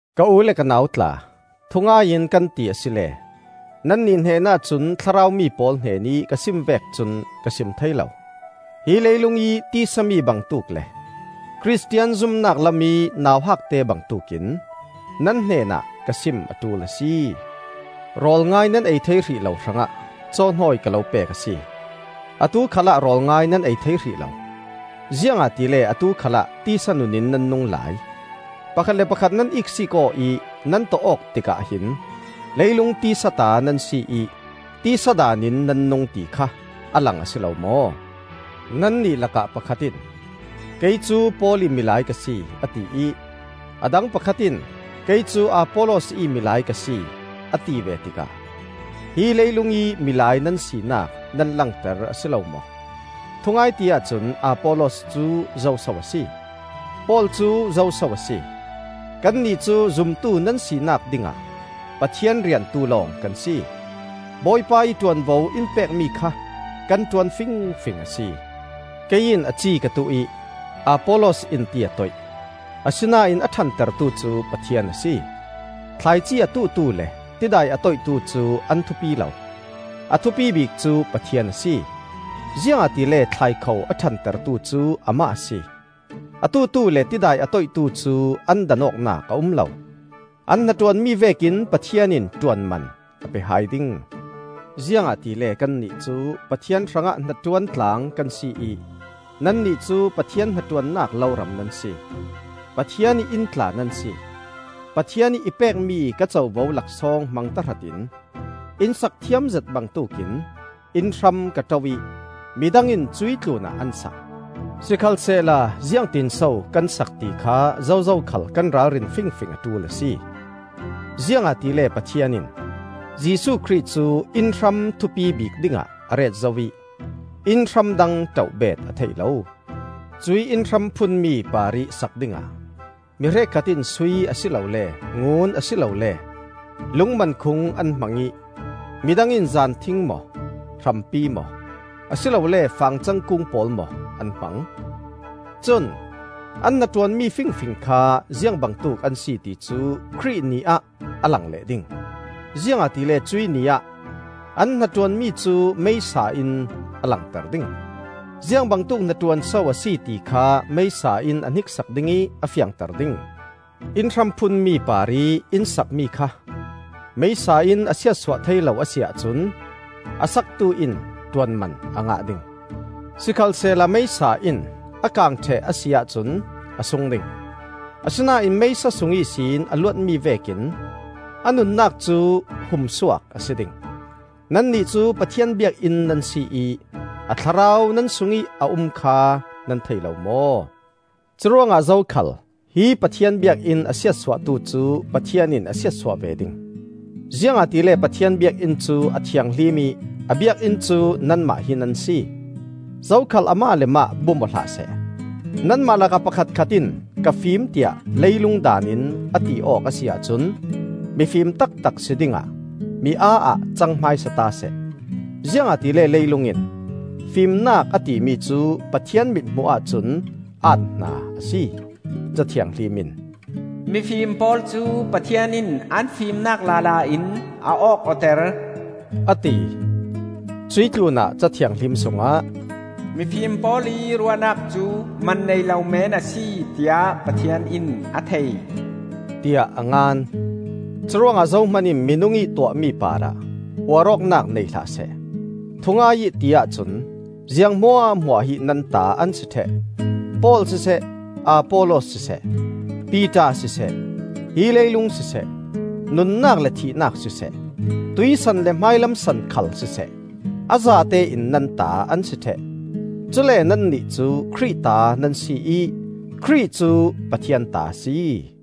Ka u le ka nau tla, thungai in kan ti asile nannih hnenah cun Thlarau mi pawl hnenih ka sim vek cun ka sim thei lo. Hi leilungih tisa mi bangtuk le Khristian zumnak lamih nauhakte bangtuk in nan hnenah ka sim a ṭul a si. Rawl ngai nan ei thei hrih lo hrangah cawhnawi ka lo pek a si. Atu khalah rawl ngai nan ei thei hrih lo, ziangahtile atu khalah tisa nun in nan nung lai. Pakhat le pakhat nan iksiik aw ih nan tawh-awk tikah hin leilung tisa ta nan si ih tisa daan in nan nung, ti kha a lang a si lo maw? Nannih lakah pakhat in, “Kei cu Paul ih milai ka si,” a ti ih a dang pakhat in, “Kei cu Apollos ih milai ka si,” a ti ve tikah hi leilungih milai nan sinak nan langter a si lo maw? Thungai ti ahcun Apollos cu zoso a si? Paul cu zoso a si? Kannih cu zumtu nan sinak dingah Pathian riantu lawng kan si. Bawipa ih ṭuanvo in pekmi kha kan ṭuan fingfing a si. Kei in a ci ka tuh ih Apollos in ti a toih, asinain a ṭhantertu cu Pathian a si. Thlaici a tuhtu le tidai a toihtu cu an thupi lo. A thupi bik cu Pathian a si, ziangahtile thlaikho a ṭhantertu cu Amah a si. A tuhtu le tidai a toihtu cu an dan awknak a um lo; an hnaṭuanmi vekin Pathian in ṭuanman a pe hai ding. Ziangahtile kannih cu Pathian hrangah hnaṭuan tlang kan si ih nannih cu Pathian hnaṭuannak loram nan si. Pathian ih inn tla nan si. Pathian ih i pekmi ka covo laksawng hmang tahratin inn sak thiamzet bangtuk in innhram ka ṭoh ih midang in cuih tlunah an sak. Sikhalsehla ziangtinso kan sak ti kha zozo khal kan ralrin fingfing a ṭul a si. Ziangahtile Pathian in Jesuh Khrih cu innhram thupi bik dingah a ret zo ih innhram dang ṭoh beet a theih lo. Cuih innhram phunmi parih sak dingah mi hrekkhat in sui a si lole ngun a si lole lungmankhung an hmangih midang in zanthing maw, hrampi maw, a si lole fangcang kung pawl maw an hmang. Cun an hnaṭuanmi fingfing kha ziangbangtuk an si ti cu Khrih Ni ah a lang leh ding. Ziangahtile cuih Ni ah an hnaṭuanmi cu meisa in a langter ding; ziangbangtuk hnaṭuan so a si ti kha meisa in a hniksak ding ih a fiangter ding. Innhram phun mi parih inn sakmi kha meisa in a siatsuah thei lo a si ahcun a saktu in ṭuanman a ngah ding. Sikhalsehla meisa in a kang ṭheh a si ahcun a sung ding; asinain meisa sung ihsin a luatmi vekin a nunnak cu humsuak a si ding. Nannih cu Pathian biakinn nan si ih a Thlarau nan sungih a um kha nan thei lo maw? Curuangah zokhal hih Pathian biakinn a siatsuahtu cu Pathian in a siatsuah ve ding. Ziangahtile Pathian biakinn cu a thianghlim ih a biakinn cu nanmah hi nan si. Zokhal amah le mah bum aw hlah seh. Nanmah lakah pakhatkhat in ka fim tiah leilung daan in a ti awk a si ahcun mifim taktak si dingah mi-aa ah cang hmaisata seh. Ziangahtile leilung in fimnak a timi cu Pathian mithmuh ahcun aat-hna a si. Ca Thianghlim in, “Mifim pawl cu Pathian in an fimnak lala in a awk awter,” a ti. Cuih tlunah Ca Thianghlim sungah, “Mifim pawl ih ruahnak cu man nei lo men a si tiah Pathian in a thei,” tiah a ngan. Curuangah zohman in minung ih tuahmi parah uar awknak nei hlah seh. Thungai ih ti ahcun ziang hmuahhmuah hi nan ta an si ṭheh; Paul siseh, Apollos siseh, Piter siseh, hi leilung siseh, nunnak le thihnak siseh, tuihsan le hmailam san khal siseh, a zatein nan ta an si ṭheh! Cule nannih cu Khrih ta nan si ih Khrih cu Pathian ta a si.